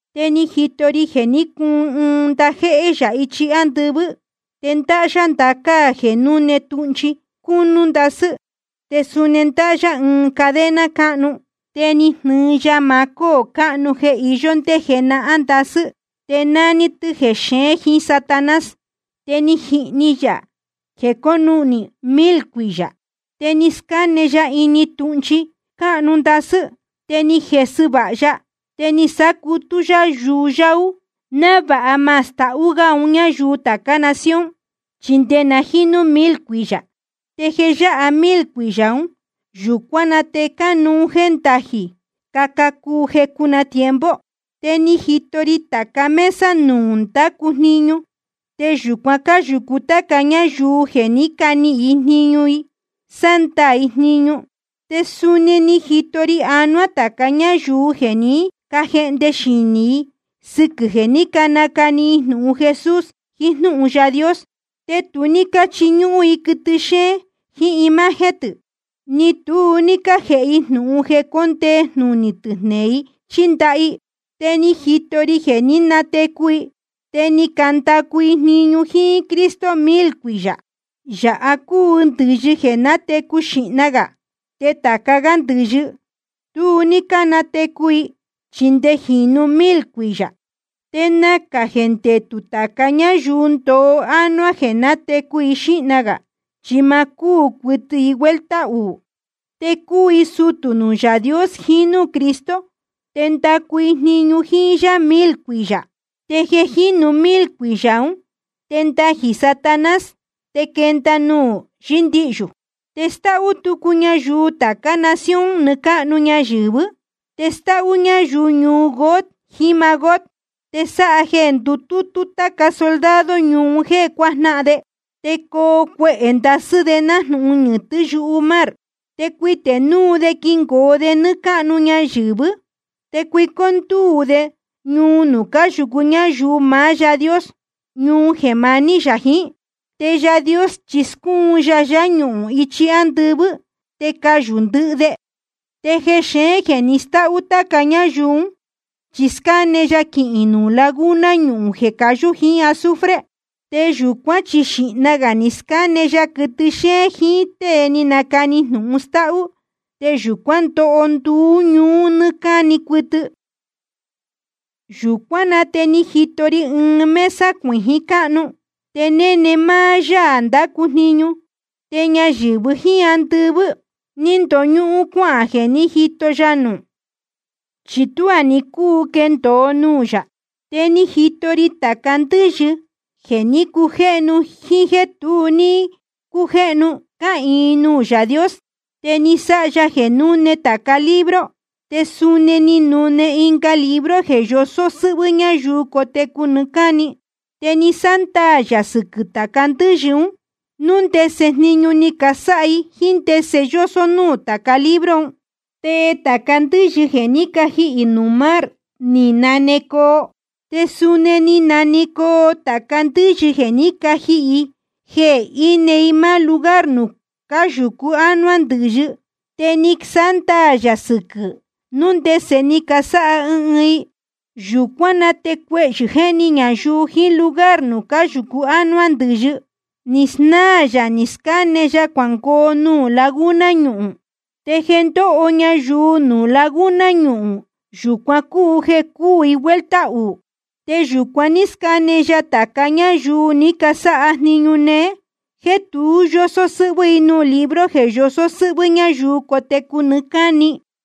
Te ni jito ri jeē ní cuun ɨɨn ndajéhé yā ichi ándɨvɨ́. Te ndáhá yá ndacáa jeē núne tūhnchi cúnú ndasɨ́. Te suni ndáhá yá ɨɨn cadena cáhnu. Te ni jnɨɨ ya maá cóō cáhnu jeē iyó ndé jenahán ndasɨ́, te nání tɨ́ jexeén jiín Satanás. Te ni jihni yā jeē conuhnī mil cuiyā. Te ni scáne ya ini tūhnchi cúnú ndasɨ́. Te ni jesɨ vāha ya, te ni sácutú yá yuyáú, návāha ma stahú gá un ñáyuu tācá nación, chi nde na jínu mil cuiyā. Te jeē yáha mil cuiyā ún, yūcuán na te cánuú jéē ndajī caca cuu jecu na tiempo. Te ni jito ri tāca mesa nuū ndácu jniñu, te yūcuan cáyūcu táca ñáyuu jeē ní canihīn jníñu i sándaā i jniñu. Te suni ni jito ri anuá tāca ñáyuu jeē ní cajehnde xinī i sɨquɨ̄ jeē ní canacani i jnūhun Jesús jiín jnúhun Yaā Dios. Te tu ní cáchiñúhún i quɨtɨ xéén jiín imagen tɨ̄, ni tu ní cájēhe i jnūhun jeē cóndee jnunī tɨ̄ jneē i chí ndaha i. Te ni jito ri jeē ní natecu i te ni candacu i jniñu jíín Cristo mil cuiyā. Yāha cúu ndɨ̄yɨ jeē nátecu xīhna gā. Te tāca gá ndɨ̄yɨ, tu ní cánatecu i, chi nde jeē jínu mil cuiyā. Te nacā jeē ndetū tāca ñáyuu ndoo ánuá jeē nátecu xīhna gā. Chi ma cúū cuɨtɨ i vuelta uū. Te cuu i sutū nuū Yaā Dios jiín núū Cristo, te ndacu i jniñu jíín yá mil cuiyā. Te jeē jínu mil cuiyā ún, te ndajī Satanás te quenda nuū yɨ́ndihyū. Te stáhú tucu ñayuu tācá nación nɨɨ́ cáhnu ñayɨ̄vɨ́. Te stáhú ñayuu ñuu Gog jiín Magog. Te sáha jeē ndutútú táca soldado ñuu un jéē cuajnáhan de. Te coo cuehē ndasɨ́ de nájnūhun ñɨ̄tɨ́ yumar. Te cuitē núu de quingoo de nɨ́ɨ́ cáhnu ñayɨ̄vɨ́. Te cuicó ndúū de ñuu nuū cáyūcu ñáyuu maá Yaā Dios, ñuu jeē maní yā jiín. Te Yaā Dios chi scúun ya ñuhūn ichi ándɨvɨ́, te cayū ndɨhɨ de. Te jexeén jeē ni stáhú táca ñáyuu ún, chi scáne ya quihīn nuū laguna ñuhūn jeē cayú jíín azufre. Te yūcuán chi xīhna gā ni scáne ya quɨtɨ xéén jiín tée ni nacani jnūhun stáhú. Te yūcuán ndoho nduú ñuú nɨ́ɨ́ cáni cuɨtɨ. Yūcuán na te ni jito ri ɨɨn mesa cuijín cáhnu, te néne máá Yaā ndácu jniñu. Te ñayɨ̄vɨ jíín andɨvɨ́ ni ndoñúhún cuáhān jeē ní jito ya nuū, chi tuá ni cúu quendōo nuū yā. Te ni jito ri tāca ndɨ́yɨ, jeē ní cujéhnu jíín jéē tu ní cujéhnu, cáhīin nuū Yaā Dios. Te ni sáha ya jeē núne tāca libro, te suni ni nune ɨnga libro jeē yosó sɨ́hvɨ́ ñáyuu cotecu nɨɨ́ cáni. Te ni sándaā yā sɨquɨ̄ tāca ndɨ́yɨ ún, núu ndese jniñu ni casáha i jíín ndese yósó núū tāca libro un. Te tāca ndɨ́yɨ jeē ní cajihī nuū mar, ni nanecoo. Te suni ni nanecoo tāca ndɨ́yɨ jeē ní cajihī i, jeē íne i máá lugar nuū cáyūcu ánuá ndɨ̄yɨ. Te ni sándaā yā sɨquɨ̄, núu ndese ni casáha ɨɨn ɨɨn i. Yūcuán na te cuehyɨ̄ jéhni ñayuu jiín lugar nuū cáyūcu ánuá ndɨ̄yɨ, ni snáā yā ni scáne ya cuangoo nuū laguna ñuhūn. Te jeē ndóho ñayuu nuū laguna ñuhūn, yūcuan cúu jeē cúū i vuelta uū. Te yūcuan ní scáne ya tāca ñáyuu ni casáha jniñu néé jéē tu yósó sɨ́hvɨ́ i nuū libro jeē yosó sɨ́hvɨ́ ñayuu cotecu nɨɨ́ cáni.